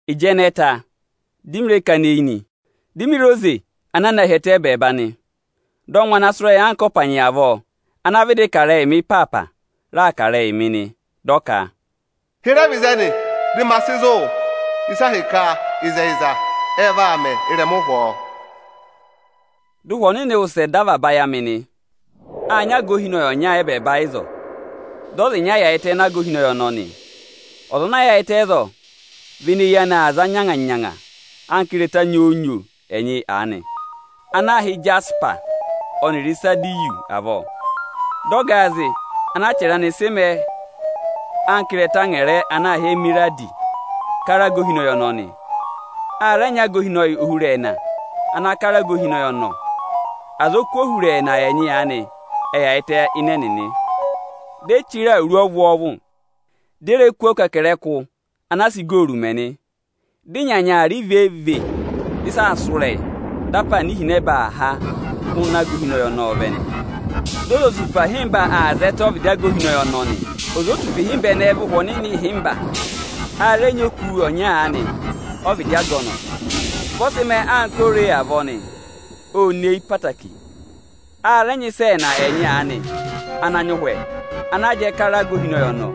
Ịjị ẹnẹẹ ta, dị mị rẹ kana eyi nị. Di mi re oze ana a na hi ẹtẹ ẹ́bẹẹba nị. Dị ọngwẹ ana sụ́ ịrẹyị anka ọpanyị avọọ, ana vịdị kà ịrẹyịị mị ịpaapa, raa kà ịrẹyịị mị nị. Dị ọ ka: Hịrẹ vẹ ịzẹnị, dị ma sị zụ̀ wụ ịsị a hị́ ka ịzẹyịza, ẹ vaa mẹ ị́rẹma ụhwọọ! Dị Ụhwẹ Ọnịnị wụsẹ dọ avaba ayị amị nị. Â nyị aga ohinọyị ọnya ẹ́bẹẹba ịzọọ, dị ọza ịnya yaayịtẹ ịnị aga ohinọyị ọnọọ nị. Ọza ana yaayịtẹ ịzọọ vị ene eyi anị aa za nyanga-nyanga anka ịrẹta nyoo-nyoo ẹnyị aanị ana aā hị́ ịjasịpa ọnịrị Ịkanẹrịyanị avọọ. Dị ọgaazị ana achẹrẹ anị sị mẹẹ ịrẹta angẹrẹ ana aā hị́ emeradi, kara aga ohinọyị ọnọọ nị. A rẹ nyị aga ohinọyị ohurẹẹna ana kara aga ohinọyị ọnọọ. Azọkụ ohurẹẹna ẹnyị aanị ệ yaayịtẹ ịnị ẹnịnị, dị e chire awuru ọvwọọvụ, dị e re kú ọkẹkẹrẹkụ ana sị igooru mẹ nị. Dị ịnyanya aa rị vee-vee, dị ịsa aa sụ́ ịrẹyị, dị apaana ihinẹba aa háa hụụnị aga ohinọyị ọnọọ vẹ nị. Dị ozotupa ịhịmba aa zẹtẹ ọvịdị aga ohinọyị nị. Ozotupa ịhịmba ẹnẹẹ vị Ụhwẹ Ohomorihi ịhịmba. A rẹ nyị oku ọnya aanị ọ́vịdị aga ọnọọ; vị ọ sị mẹẹ anka ore avọọ nị, ô nyeeyi ẹtẹẹtẹrẹ. A rẹ nyị ịsa ẹẹna ẹnyị aanị ana nyị ụhwẹ, ana jẹẹ kara aga ohinọyị ọnọọ.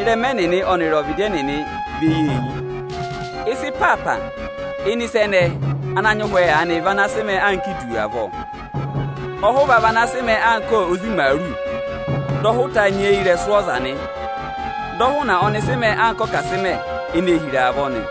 Ịrẹma ẹnịnị ọnịrị ọvịdị ẹnịnị vị eyi-eyi. Ịsa ịpaapa ịnị ịsa ana nyị ụhwẹ aanị vị ana sị mẹẹ anka idu avọọ, ọhụva vị ana sị mẹẹ anka ozi imaaru; dị ọhụta nyị eyirẹsụ ọza nị; Dị ọhụna ọnị sị mẹẹ anka ọkasịmẹ ene ee hira avọọ nị.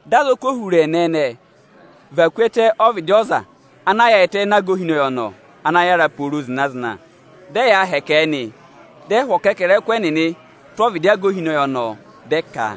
dị azọkụ ohurẹẹna ẹnẹẹ và ku ẹtẹ ọvịdị ọza ana yaayịtẹ ịnị aga ohinọyị ọnọọ ana yára pooro zịna-zịna, dị ẹyaa hẹkẹ ẹ. Dị ẹ hụ̀ ọkẹkẹrẹkụ ẹnịnị tụ́ ọvịdị aga ohinọyị, dị ẹ ka: